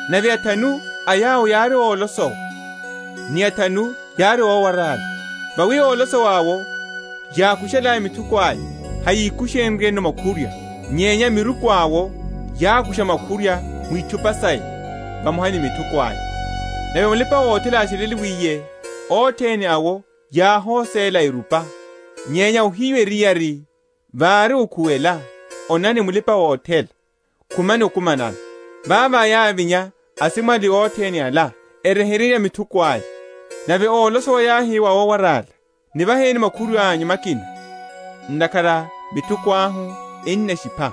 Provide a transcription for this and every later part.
Nave athanu a yawo yári ólosowa, ni athanu yári ówarála. Vawi ólosowa’wo, yákushalaya mithuko aya, hayikushe?-?nryeno makhurwa: nyenya a miruku awo yákusha makhurwa mu itchupa saya, vamoha ni mithuko aya. Nave mulipa‐othela ásheleliwiye, othene awo yáhoséla, erupa. Nyenya ohiyu eriyari vári okhuwela, Onani, mulipa‐othela! khumani okumanano. Vavo yávinya asimwali othene ala, eryeherya mithuko aya. Nave ólosowa yáhi wa ówarála, Nivaheni makhurwa’nyu makina; ntakhara mithuko ahu enamshipha.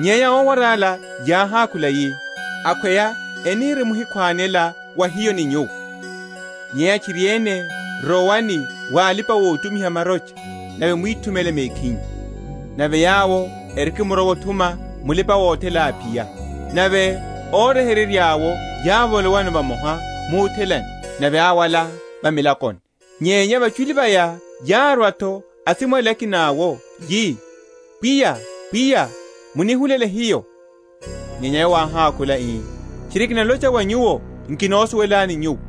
Nyenya ówarála yáhákhula yi, Akhweya enirimhikhwanela wa hiyo ni nyuwo: nyenya tchiriene rowani wa alipa‐otumiha marocha, nave mwithumele mekhinyu. Nave yawo erikimrowa othuma, mulipa‐othela áphiya; nave óryeheryeya’wo yávolowano vamoha muthelani: nave áwala va milakoni. Nyenya vachuli vaya yárwa’tho asimwali akina’wo, yi, Pwiya, Pwiya, munihulele hiyo. Nyenya yowo áhákhula, ii, Tchiri kinalocha wa nyuwo, nkinosuwelani nyuwo.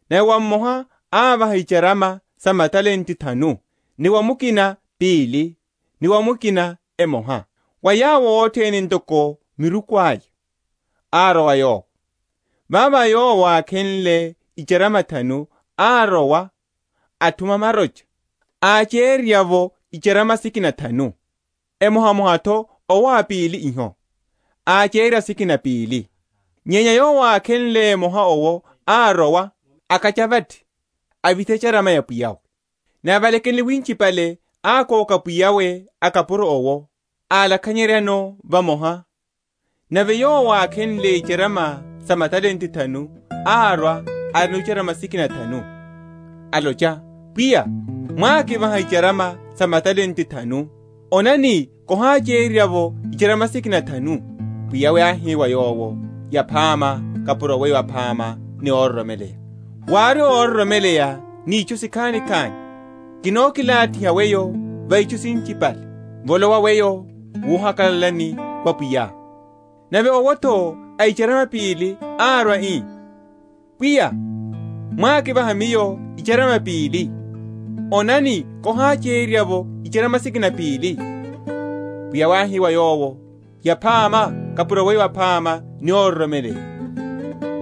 Nave wa mmoha ávaha icharama sa matalente thanu, ni wa mukina pili, ni wa mukina emoha; wa yawo othene ntoko miruku aya; arowa yowo. Vavo yowo ákhenle icharama thanu, árowa othuma marocha, áchererya’vo icharama sikina thanu. Emohamoha’tho owo a pili iho, áháchererya sikina pili. Nyenya yowo ákhenle emoha owo árowa, akacha vathi, avitha echarama ya pwiyawe. Nave valekenle winchipale, ákoka pwiya a akapuro awo, álakhanyeryano vamoha. Nave yowo ákhenle icharama sa matalente thanu árwa, arino icharama sikina thanu, alocha, Pwiya, mwákivaha icharama sa matalente thanu, onani kiháchererya’vo icharama sikina thanu. Pwiya’we áhi wa yowo, Yaphama, kapuro weyo aphama ni óroromeleya; wári óroromeleya ni itchu sikhani, kinakilathiha weyo va itchu sinchipale: volowa weyo wuhakalalani wa pwiyá. Nave owo’tho a icharama pili árwa, ii, Pwiya, mwákivaha miyo icharama pili; onani, kiháchererya’vo icharama sikina pili. Pwiya’we áhi wa yowo, Yaphama kapuro weyo aphama ni óroromeleya;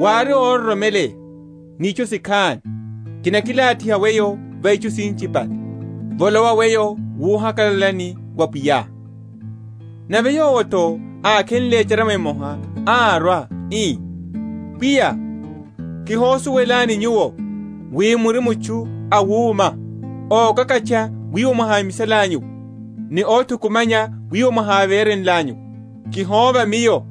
wári óroromeleya ni itchu sikhani, kinakilathiha weyo va itchu sinchipale: volowa weyo wuhakalalani wa pwiyá. Nave yowo’tho ákhenle echarama emoha, árwa, ii, Pwiya kihosuwelani nyuwo wi muri mutchu awuma, ókakatcha wiwo mwahámisalanyu’wo, ni óthukumanya wiwo mwaháverenlanyu’wo: kihóva miyo,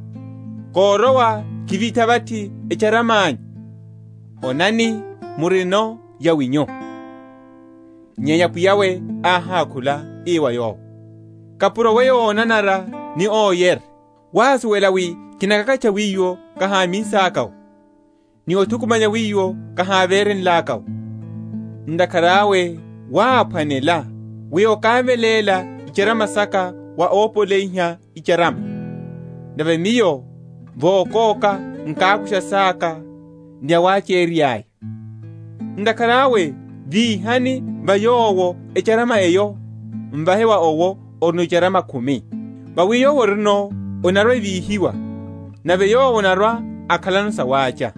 korowa, kivitha vathi echarama’nyu: onani, murino yawinyu. Nyenya pwiya’we áhákhula, ii wa yowo, Kapuro weyo ónanara ni óyere, wásuwela wi kinakakatcha wiwo kaháminsaka’wo, ni othukumanya wiwo kahávere?-?nlaka’wo, ntakhara awe wáphwanela, wi okáveléla icharama saka wa ópoleyiha icharama, nave miyo vokóka nkákusha saka ni yawachererya’ya. Ntakhara awe víhani wa yowo echarama eyo, m’vahe wa owo orino icharama khumi. Vawi wa yowo orino, enarwa‐evahiwa, nave yowo anarwa‐akhalano sawácha: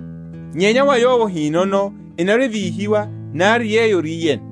nyenya wa yowo ahínono, enarwa‐evíhiwa, nari yeyo áriyeno.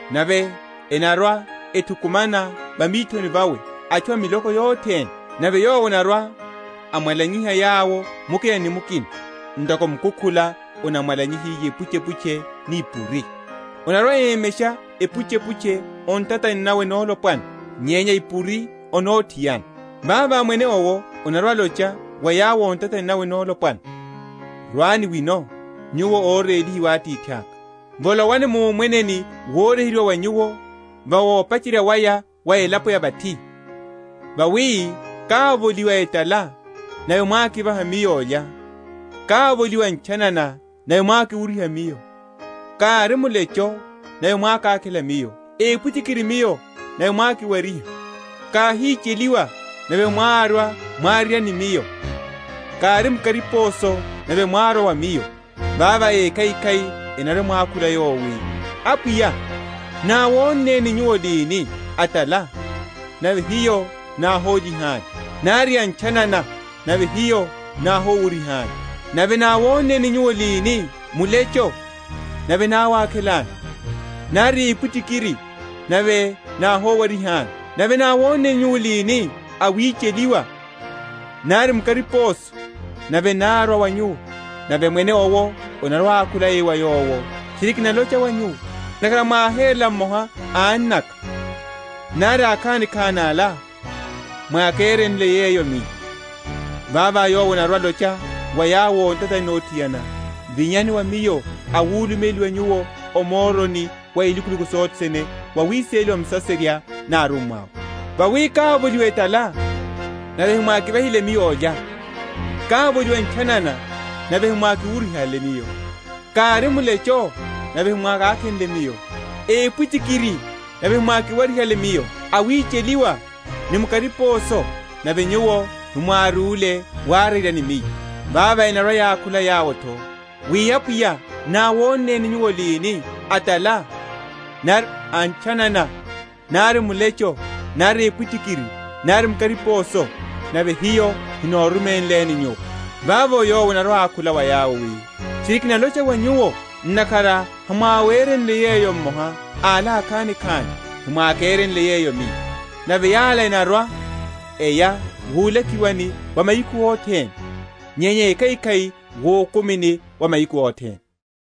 nave enarwa‐ethukumana va mithoni vawe atchu a miloko yothene: nave Yowo anarwa‐amwa?-?lanyiha yawo mukina ni mukina, ntoko mukukhula anamwalanyihiye ipuchepuche ni ipuri: anarwa‐emesha ipuchepuche o ntatani nawe nolopwana, nyenya ipuri o nothiana. Vavo Mwene owo anarwa‐alocha wa yawo o ntatani nawe nolopwana, Rwani wino nyuwo órélihiwa a Atithaka, volowani mu Omweneni woryeheryiwa wa nyuwo va opacherya waya wa elapo ya vathi: vawi kávoliwa etala, nave mwákivaha Miyo olya; kávoliwa ntchanana, nave mwákiwuryiha Miyo; kári mulecho, nave mwákakhela Miyo; epwitikiri Miyo, nave mwákiwariha; káhicheliwa, nave mwárwa warerya ni Miyo; kári mu kariposo, nave mwárwa wa Miyo. Vavo ékhaikhai enarwa‐emwakhula Yowo wi, Apwiya, náwonneni Nyuwo lini a’tala, nave hiyo náhólyihani? nari antchanana, nave hiyo náhówuryihani? Nave náwonneni Nyuwo lini mulecho, nave náwákhelani, nari epwitikiri, nave náhowarihani? Nave náwonneni Nyuwo lini awicheliwa, nari mu kariposo, nave nárwa wa Nyuwo? Nave Mwene owo anarwa‐ákhula ii wa yawo, Tchiri kinalocha wa nyuwo, Ntakhara mwáherela mmoha a annaka, nari akhanikhani ala, mwákerenle yeyo Miyo. Vavo Yowo anarwa‐alocha wa yawo o ntatani nothiana, Vinyani wa Miyo awulumeliwa nyuwo, o moroni wa ilukuluku sothene wawiseleliwa Musaserya ni arummwa’we: vawi kávoliwa etala, nave hemwákivahile Miyo olya: kávoliwa ntchanana, nave hemwákiwuryihale Miyo: kári mulecho, nave hemwákákhenle Miyo: epwitikiri nave hemwákiwarihale Miyo: awicheliwa, ni mu kariposo, nave nyuwo hemwárúle warerya ni Miyo. Vavo enarwa‐yakhula yawo’tho, wi, Apwiya, náwonneni nyuwo lini a’tala, nari antchanana, nari mulecho, nari epwitikiri, nari mu kariposo, nave hiyo hanóruménleni Nyuwo. Vavo Yowo anarwa‐awakhula yawo wi, Tchiri kinalocha wa nyuwo, Ntakhara hamwérenle yeyo mmoha a ala akhanikhani, hemwákerenle yeyo Miyo. Nave yala enarwa‐eya wulakiwani wa mahiku othene; nyenya ékhaikhai wukumini wa mahiku othene.